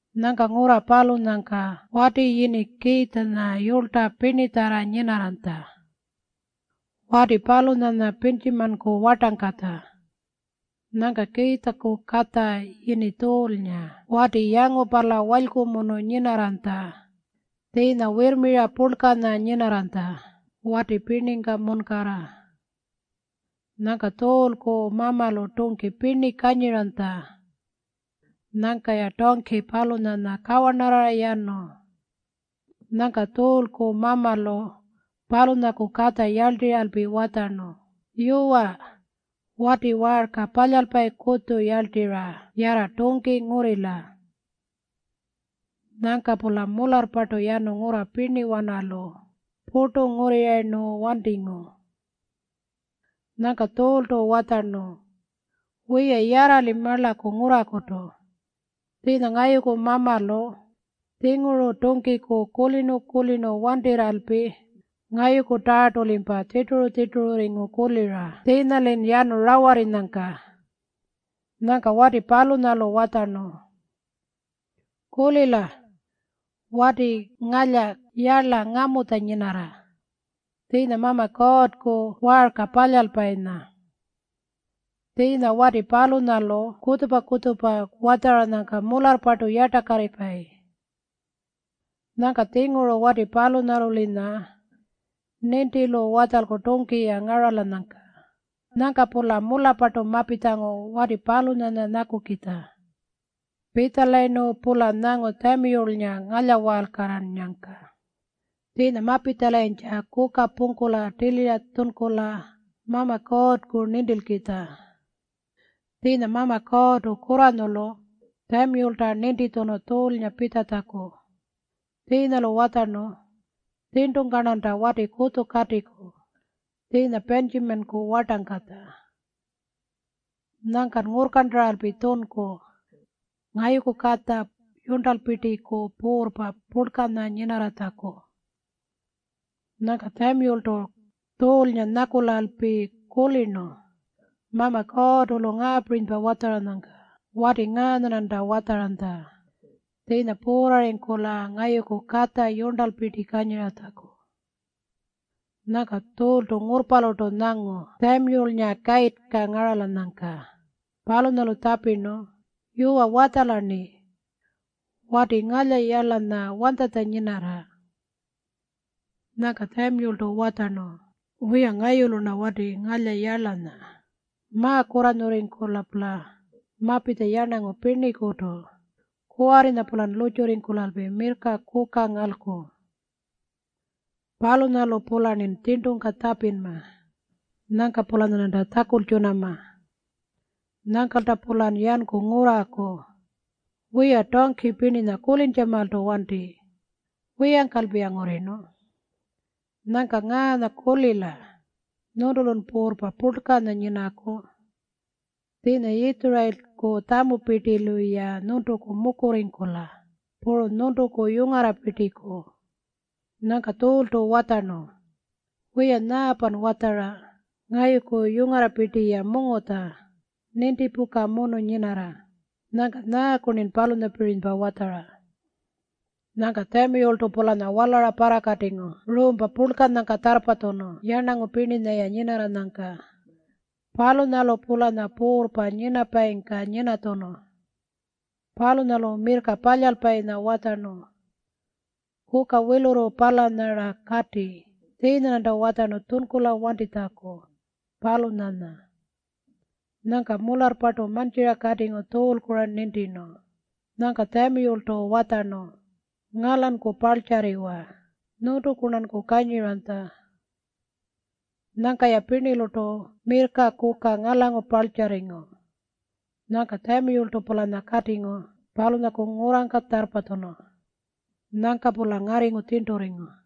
Nyangka ngurra palunyangka wati yini Kiitjanya yulytja pirnitjarra nyinarranytja. Wati palunyanya Pintjimanku wartangkatja. Nyangka Kiitjaku katja yini Tjuulnga wati yangupala walykumunu nyinarranytja. Tjiinya wirrmira purlkanya nyinarranytja wati pirningka munkarra. Nyangka Tjuulku mamalu tungki pirni kanyiranytja. Nyangka-ya tungki palunyanya kawarnarrara yanu. Nyangka Tjuulku mamalu palunyaku katja yarltirralpi watjarnu, “Yuwa, wati waarka palyalpayi kutju yarltirra yarra tungki ngurrila.” Nyangka-pula mularrpartu yanu ngurra pirniwanalu purtu ngurrirayirnu wantingu. Nyangka Tjuultu watjarnu, “Wiya, yarra-li marlaku ngurrakutu. Tjiinya ngayuku mamalu tjinguru tungkiku kulirnu-kulirnu wantirralpi ngayukutarrartu-limpa tjirturu-tjirtururringu kulira tjiinya-lin yanu rawarrinyangka.” Nyangka wati palunyalu watjarnu, “Kulila. Wati ngalya yarla ngamutja nyinarra. Tjiinya Mama Kuurrku waarka palyalpayinya. Tjiinya wati palunyalu kutjupa-kutjupa watjaranyangka mularrpartu yartakarripayi. Nyangka-tjinguru wati palunyalu-linya nintilu watjalku tungki-ya ngaralanyangka.” Nyangka-pula mularrpartu mapitjangu wati palunyanya nyakukitja. Pitjalayirnu-pula nyangu Tjamiyulnga ngalyawaalkarrarnu. Tjiinya mapitjalayintja kuka pungkula tilira tjunkula Mama Kuurrku nintilkitja. Tjiinya Mama Kuurrtu kurranyulu Tjamiyulta nintitjunu Tjuulnga pitjatjaku. Tjiinya-lu watjarnu, “Tjirntungka-rnanta wati kutju katiku tjiinya Pintjimanku wartangkatja. Nyangkan ngurrkarntaralpi tjunku ngayuku katja yurntalpirtiku puurrpa purlkanya nyinarratjaku.” Nyangka Tjamiyultu Tjuulnga nyakulalpi kulirnu Mama Kuurrtu-lu ngaapirinypa watjaranyangka, “Wati ngaanya-rnanta watjaranytja tjiinya puurrarrirra ngayuku katja yurntalpirti kanyiratjaku.” Nyangka Tjuultu ngurrpalurtu nyangu Tjamiyulnga kayirrta ngaralanyangka. Palunyalu tjapirnu, “Yuwa, watjala-rni. Wati ngalya yarlanya wanytjanya nyinarra?” Nyangka Tjamiyultu watjarnu, “Wiya, ngayulu-rna wati ngalya yarlanya. Ma-kurranyurrirra-pula mapitja yarnangu pirnikutu. Kuwarrinya-pulan lurrtjurringkulalpi mirrka kuka ngalku. Palunyalu-pularnin tjirntungka tjapinma. Nyangka-pulanyarnanta tjakultjunama. Nyangkalta-pulan yanku ngurraku. Wiya, tungki pirninya kulintjamaaltu wanti. Wiyangkalpi-ya ngurrirnu. Nyangka ngaanya kulila. Nyuntulun puurrpa purlkanya nyinaku. Tjiinya Yitjurayilku tjamupirtilu-ya nyuntuku mukurringkula, puru nyuntuku yungarrapirtiku.” Nyangka Tjuultu watjarnu, “Wiya, nyaapan watjara? Ngayuku yungarrapirti-ya mungutja, nintipukamunu nyinarra. Nyangka nyaaku-rnin palunyapirinypa watjara?” Nyangka Tjamiyultu-pulanya walara parrakatingu ruumpa purlkanyangka tjarrpatjunu yarnangu pirninya-ya nyinarranyangka. Palunyalu-pulanya puurrpa nyinapayingka nyinatjunu. Palunyalu mirrka palyalpayinya watjarnu, “Kuka wilurru palanya-ra kati. Tjiinya-rnanta watjarnu tjunkulan wantitjaku, palunyanya.” Nyangka mularrpartu mantjira katingu Tjuulku-ra nintirnu. Nyangka Tjamiyultu watjarnu, “Ngalanku parltjarriwa. Nyuntuku-rnanku kanyiranytja.” Nyangka-ya pirnilurtu mirrka kuka ngalangu parltjarringu. Nyangka Tjamiyultu-pulanya katingu palunyaku ngurrangka tjarrpatjunu. Nyangka-pula ngarringu tjirnturringu.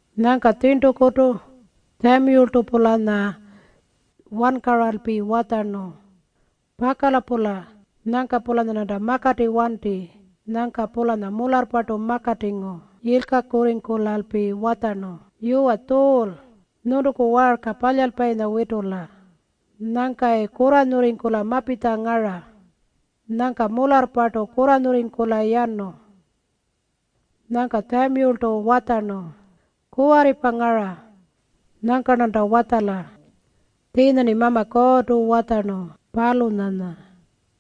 Nyangka tjirntukutu Tjamiyultu-pulanya wankaralpi watjarnu, “Pakala-pula nyangka-pulanyarnanta makati wanti.” Nyangka-pulanya mularrpartu makatingu yilkakurringkulalpi watjarnu, “Yuwa Tjuul, nyuntuku waarka palyalpayinya witula. Nyangkayi kurranyurringkula mapitja ngara.” Nyangka mularrpartu kurranyurringkula yanu. Nyangka Tjamiyultu watjarnu, “Kuwarripa ngara. Nyangka-rnanta watjala tjiinya-rni Mama Kuurrtu watjarnu, palunyanya.”